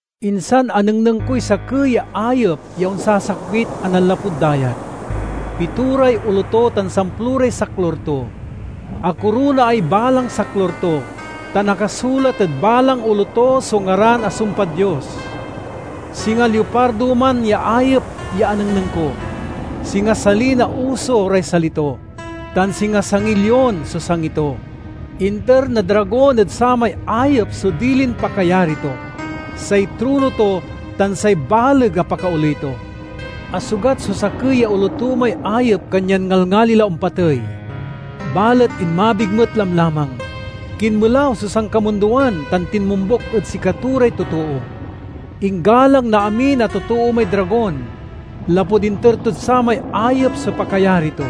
Insan anengneng koy sakey ya ayep ya onsasakbit a nanlapud dayat. Pitoray olo to tan samploray saklur to. Akoronaay balang saklur to, tan akasulat ed balang olo to so ngaran a sumpad Dios. Singa liopardo man ya ayep ya anengneng ko. Singa sali na uso ray sali to, tan singa sangiy lion so sangi to. Inter na dragon ed samay ayep so dilin pakayari to, say trono to, tan say baleg a pakaoley to. Asugat so sakey ya olo to may ayep kanyan ngalngali la ompatey, balet inmabig met lamlamang. Kinmelaw so sankamundoan tan tinmombuk ed sikato ray totoo. Inggalang na amin a totoo may dragon, lapud inter tod samay ayep so pakayari to.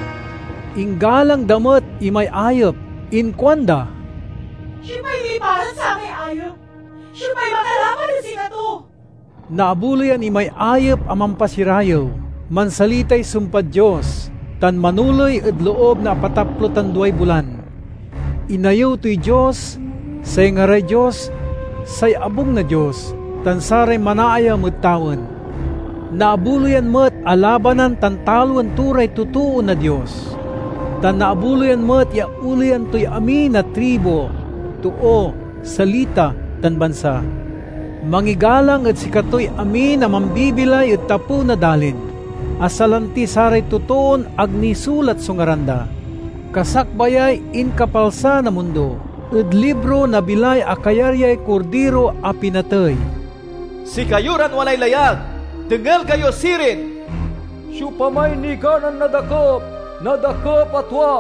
Inggalang da met imay ayep. Inkuanda, "Siopay miparad samay ayep? Siopay makalaban ed sikato?" Naabuloyan imay ayep a mampasirayew, mansalitay sumpad Dios, tan manoley ed loob na apataplo tan duay bulan. Inayew toy Dios, say ngaray Dios, say abung na Dios, tan saray manaayam ed tawen. Naabuloyan met a labanan tan taloen to ray totoo na Dios, tan naabuloyan met ya oleyan toy amin a tribu, too, salita, tan bansa. Mangigalang ed sikatoy amin a mambibilay ed tapew na dalin, a salanti saray totoon ag nisulat so ngaran da, kasakbayay inkapalsa na mundo, ed libro na bilay a kayaryay Kordiro a pinatey. "Sikayo ran walay layag, dengel kayo sirin! Siopamay niganan nadakep, nadakep a tua.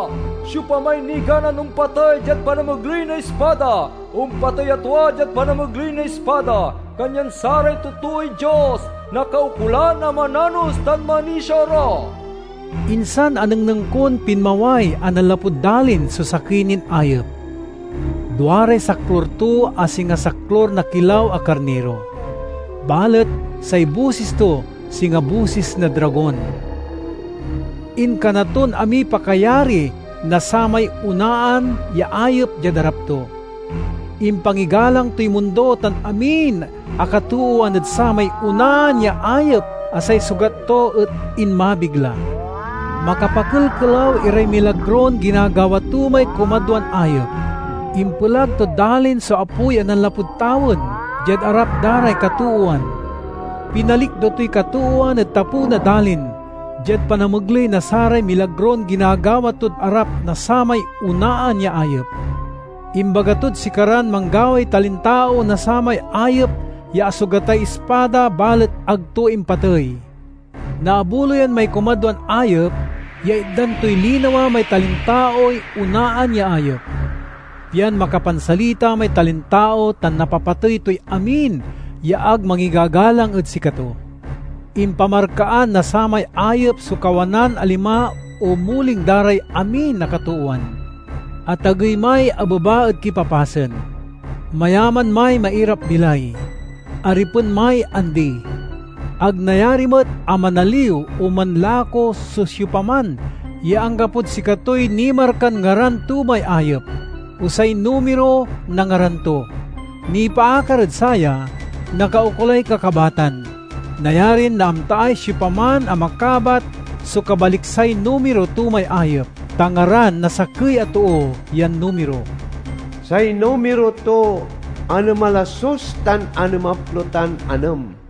Siopamay niganan ompatey diad panamegley na ispada, ompatey a tua diad panamegley na ispada. Kanyan saray totooy Dios nakaukolan a mananos tan manisia ra." Insan anengneng kon pinmaway a nanlapud dalin so sakey nin ayep. Duaray saklur to a singa saklur na kilaw a karniro, balet say bosis to singa bosis na dragon. Inkana ton amiy pakayari na samay onaan ya ayep diad arap to. Impangigalang toy mundo tan amin a katoowan ed samay onaan ya ayep a say sugat to et inmabig la. Makapakelkelaw iray milagron ginagawa to may kumadwan ayep. Impelag tod dalin so apoy a nanlapud tawen, diad arap da ray katoowan. Pinalikdo toy katoowan ed tapew na dalin diad panamegley na saray milagron ginagawa tod arap na samay onaan ya ayep. Imbaga tod sikaran manggaway talintao na samay ayep ya asugatay ispada balet ag to impatey. Naabuloyan may kumadwan ayep ya itdan toy linawa may talintaoy onaan ya ayep, pian makapansalita may talintao tan napapatey toy amin ya ag mangigagalang ed sikato. Impamarkaan na samay ayep so kawanan a lima o muling da ray amin a katoowan, atagey may abeba ed kipapasen, mayaman may mairap-bilay, aripen may andi. Ag nayari met a manaliw o manlako so siopaman ya anggapod sikatoy nimarkan ngaran to may ayep, o say numiro na ngaran to. Nipaakar ed saya, nakaukolay kakabatan. Nayarin naamtaay siopaman a makabat so kabaliksay numiro to may ayep, ta ngaran na sakey a too yan numiro. Say numiro to anem a lasus tan anemaplo tan anem.